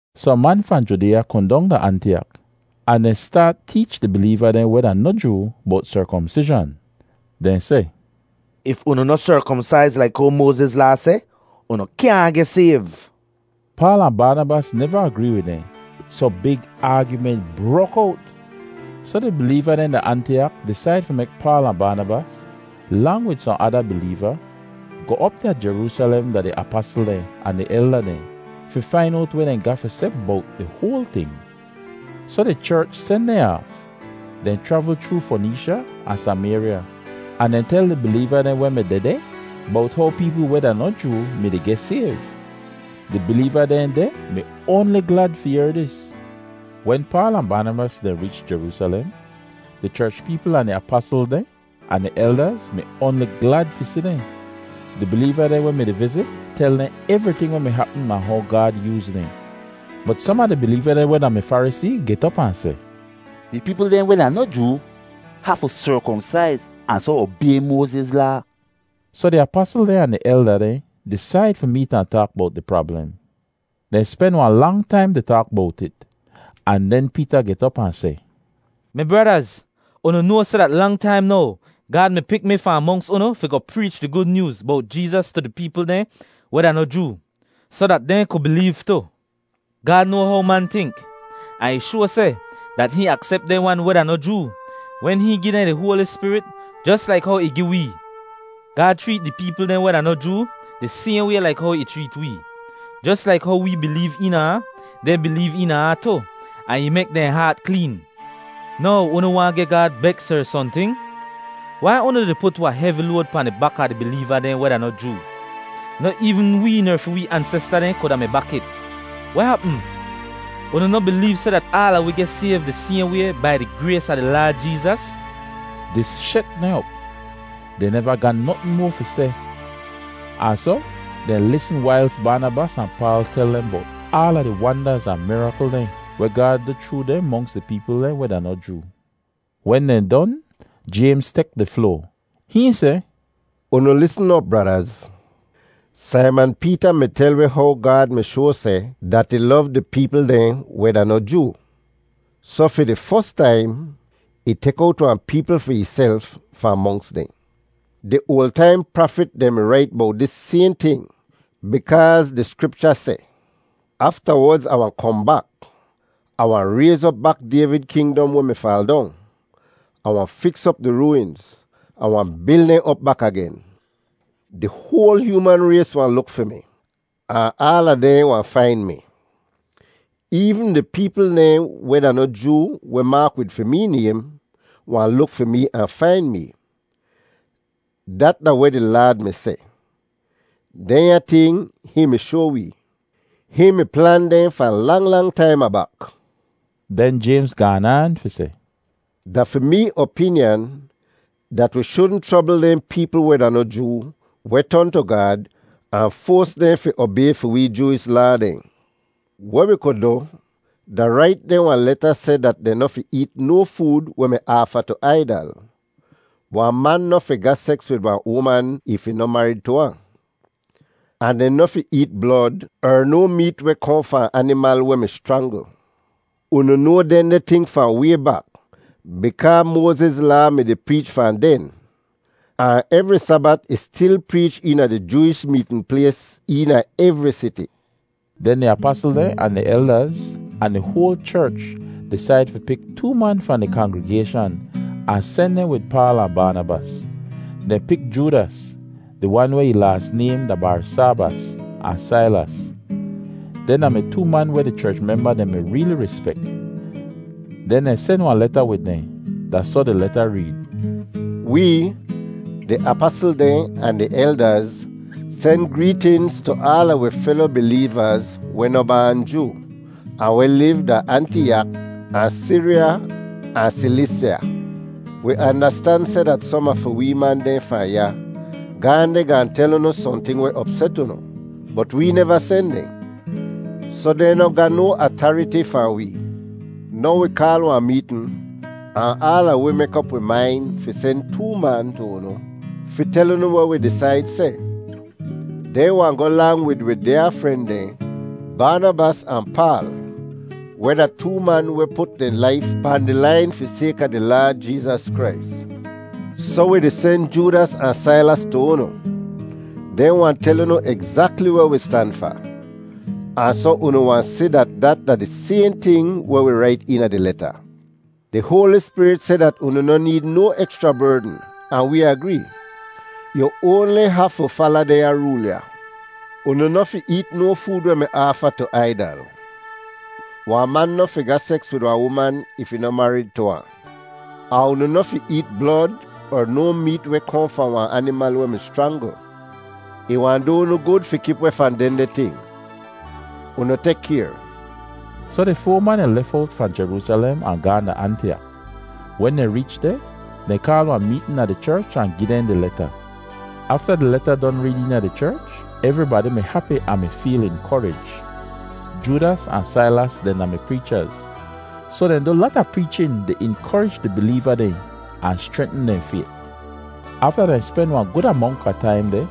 Sohn man fahn Judeeya kohn dong da Antiyak ahn dehn staat teech di bileeva dehn weh da noh Joo bowt serkomsizhan. Dehn seh, “If unu noh serkomsaiz laik how Moaziz Laa seh, unu kyaahn geh sayv.” Paal ahn Baanabas neva agree wid dehn, soh big aagyument brok owt. Soh di bileeva dehn da Antiyak disaid fi mek Paal ahn Baanabas, lang wid sohn ada bileeva, goh op da Jeroosalem da di apasl dehn ahn di elda dehn, fi fain owt weh dehn ga fi seh bowt di hoal ting. Soh di cherch sen dehn aaf. Dehn chravl chroo Foneesha ahn Samayrya ahn dehn tel di bileeva dehn weh mi dehdeh bowt how peepl weh da noh Joo mi-di geh sayv. Di bileeva dehn deh mi oanli glad fi yehr dis. Wen Paal ahn Baanabas dehn reech Jeroosalem, di cherch peepl ahn di apasl dehn ahn di eldaz mi oanli glad fi si dehn. Di bileeva dehn weh mi-di vizit tel dehn evriting weh hapm ahn how Gaad yooz dehn. Bot som a di bileeva dehn weh da-mi Farisee get op ahn seh, “Di peepl dehn weh da noh Joo hafu serkomsaiz ahn soh obay Moaziz Laa.” Soh di apasl dehn ahn di elda dehn disaid fi meet ahn taak bowt di prablem. Dehn spen wahn lang taim di taak bowt it, ahn den Peeta get op ahn seh, “Mi bradaz, unu noa seh dat lang taim now Gaad mi pik mi fahn monks unu fi goh preech di Gud Nyooz bowt Jeezas tu di peepl dehn weh da noh Joo, soh dat dehn ku bileev tu. Gaad noa how man tink, ahn ih shoa seh dat hihn aksep dehn wan weh da noh Joo wen hihn gi dehn di Hoali Spirit jos laik how ih gi wee. Gaad chreet di peepl dehn weh da noh Joo di sayhn way laik how ih chreet wee. Jos laik how wee bileev eena ahn, dehn bileev eena ahn tu ahn ih mek dehn haat kleen. Now unu waahn geh Gaad beks er sohnting? Wai unu di put wahn hevi load pahn di bak a di bileeva dehn weh da noh Joo? Noh eevn wee ner fi wee ansesta dehn kuda mi bak it. Weh hapm? Unu noh bileev seh dat aala wi geh sayv di sayhn way, bai di grays a di Laad Jeezas?” Dis shet dehn op. Dehn neva ga notn moa fi seh ahn soh dehn lisn wailz Baanabas ahn Paal tel dehn bowt aala di wandaz ahn mirakl dehn weh Gaad du chroo dehn monks di peepl dehn weh da noh Joo. Wen dehn don, Jaymz tek di floa. Hihn seh, “Unu lisn op, bradaz. Saiman Peeta mi tel wi how Gaad mi shoa seh dat ih lov di peepl dehn weh da noh Joo. Soh fi di fos taim, ih tek owt wahn peepl fi ihself fahn monks dehn. Di oal taim prafit dehn mi rait bowt dis sayhn ting bikaaz di Skripcha seh, ‘Aftawodz Ah wahn kohn bak. Ah wahn rayz op bak Dayvid kingdom weh mi faal dong. Ah wahn fiks op di rooinz, Ah wahn bil dehn op bak agen, Di hoal hyooman rays wahn luk fi mi; ahn aala dehn wahn fain mi. Eevn di peepl dehn weh da noh Joo weh maak wid fi mee naym, wahn luk fi mee ahn fain mee. Dat da weh di Laad mi seh, dehnya ting hihn mi shoa wee. Hihn mi plan dehn fahn lang lang taim abak.’” Den Jaymz gaan aan fi seh, “Da fi mee opinyan dat wi shudn chrobl dehn peepl weh da noh Joo weh ton tu Gaad, ahn foas dehn fi obay fi wee Jooish Laa dehn. Weh wi ku du da rait dehn wahn leta seh dat dehn noh fi eet no food weh mi aafa tu aidal; wahn man noh fi ga seks wid wahn uman if ih noh marid tu ahn; ahn dehn noh fi eet blod er no meet weh kohn fahn animal weh mi schrangl. Unu noa dehndeh ting fahn way bak bikaa Moaziz Laa mi-di preech fahn den, ahn evri Sabat ih stil preech eena di Jooish meetn plays eena evri siti.” Den di apasl dehn, ahn di eldaz, ahn di hoal cherch disaid fi pik too man fahn di kangrigayshan ahn sen dehn wid Paal ahn Baanabas. Dehn pik Joodas, di wan weh ih laas naym da Barsaabas, ahn Sailas. Dehn da-mi too man weh di cherch memba dehn mi reeli rispek. Den dehn sen wahn leta wid dehn. Da soh di leta reed: Wee, di apasl dehn ahn di eldaz, sen greetinz tu aala wi felo bileevaz weh noh baan Joo, ahn weh liv da Antiyak ahn Siriya ahn Silisya. Wi andastan seh dat som a fi wee man dehn fahn ya gaahn deh gaahn tel unu sohnting weh opset unu, bot wee neva sen dehn. Soh dehn noh ga no atariti fahn wee. Now wi kaal wahn meetn ahn aala wi mek op wi main fi sen too man tu unu fi tel unu weh wi disaid seh. Dehn wahn goh lang wid wi dyaa fren dehn, Baanabas ahn Paal, weh da too man weh put dehn laif pahn di lain fi sayka di Laad Jeezas Krais. Soh wi di sen Joodas ahn Sailas tu unu. Dehn wahn tel unu egzakli weh wi stan fa, ahn soh unu wahn si dat dat da di sayhn ting weh wi rait eena di leta. Di Hoali Spirit seh dat unu noh need no ekschra berdn ahn wee agree. Yu oanli hafu fala dehnya rool ya: Unu noh fi eet no food weh mi aafa tu aidal; wahn man noh fi ga seks wid wahn uman if ih noh marid tu ahn; ahn unu noh fi eet blod er no meet weh kohn fahn wahn animal weh mi schrangl. Ih wahn du unu gud fi kip weh fahn dehndeh ting. Unu tek kayr. Soh di foa man dehn lef owt fahn Jeroosalem ahn gaahn da Antiyak. Wen dehn reech deh, dehn kaal wahn meetn a di cherch ahn gi dehn di leta. Afta di leta don reed eena di cherch, evribadi mi hapi ahn mi feel inkorij. Joodas ahn Sailas dehn da-mi preechaz, soh dehn du lata preechin di inkorij di bileeva dehn ahn schrentn dehn fayt. Afta dehn spen wahn gud amonk a taim deh,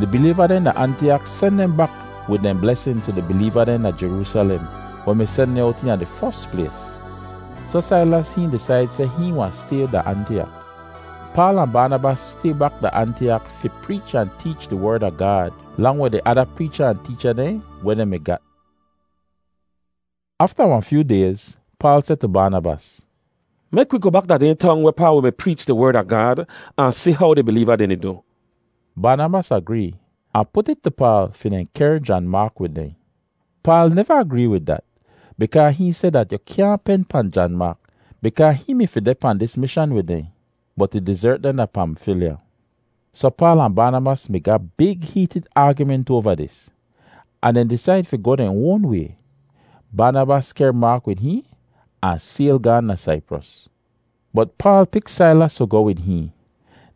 di bileeva dehn da Antiyak sen dehn bak wid dehn blesin tu di bileeva dehn da Jeroosalem weh mi sen dehn owt eena di fos plays. [Soh Sailas hihn disaid seh hihn wahn stay da Antiyak.] Paal ahn Baanabas stay bak da Antiyak fi preech ahn teech di Werd a Gaad lang wid di ada preecha ahn teecha dehn weh dehn mi gat. Afta wahn fyoo dayz, Paal seh tu Baanabas, “Mek wi goh bak da dehn tong wehpaa wi mi preech di Werd a Gaad ahn si how di bileeva dehn di du.” Baanabas agree ahn put it tu Paal fi dehn kehr Jan Maak wid dehn. Paal neva agree wid dat bikaa hihn seh dat yu kyaahn pen pahn Jan Maak bikaa hihn mi fi deh pahn dis mishan wid dehn, bot ih dizert dehn da Pamfilya. Soh Paal ahn Baanabas mi ga big heetid aagyument oava dis, ahn dehn disaid fi goh dehn oan way. Baanabas kehr Maak wid hihn ahn sayl gaahn da Saipros. Bot Paal pik Sailas fi goh wid hihn.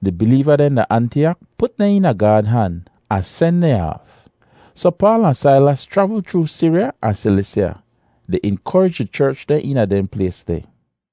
Di bileeva dehn da Antiyak put dehn eena Gaad han ahn sen dehn aaf. Soh Paal ahn Sailas chravl chroo Siriya ahn Silisya di inkorij di cherch dehn eena dehn plays deh.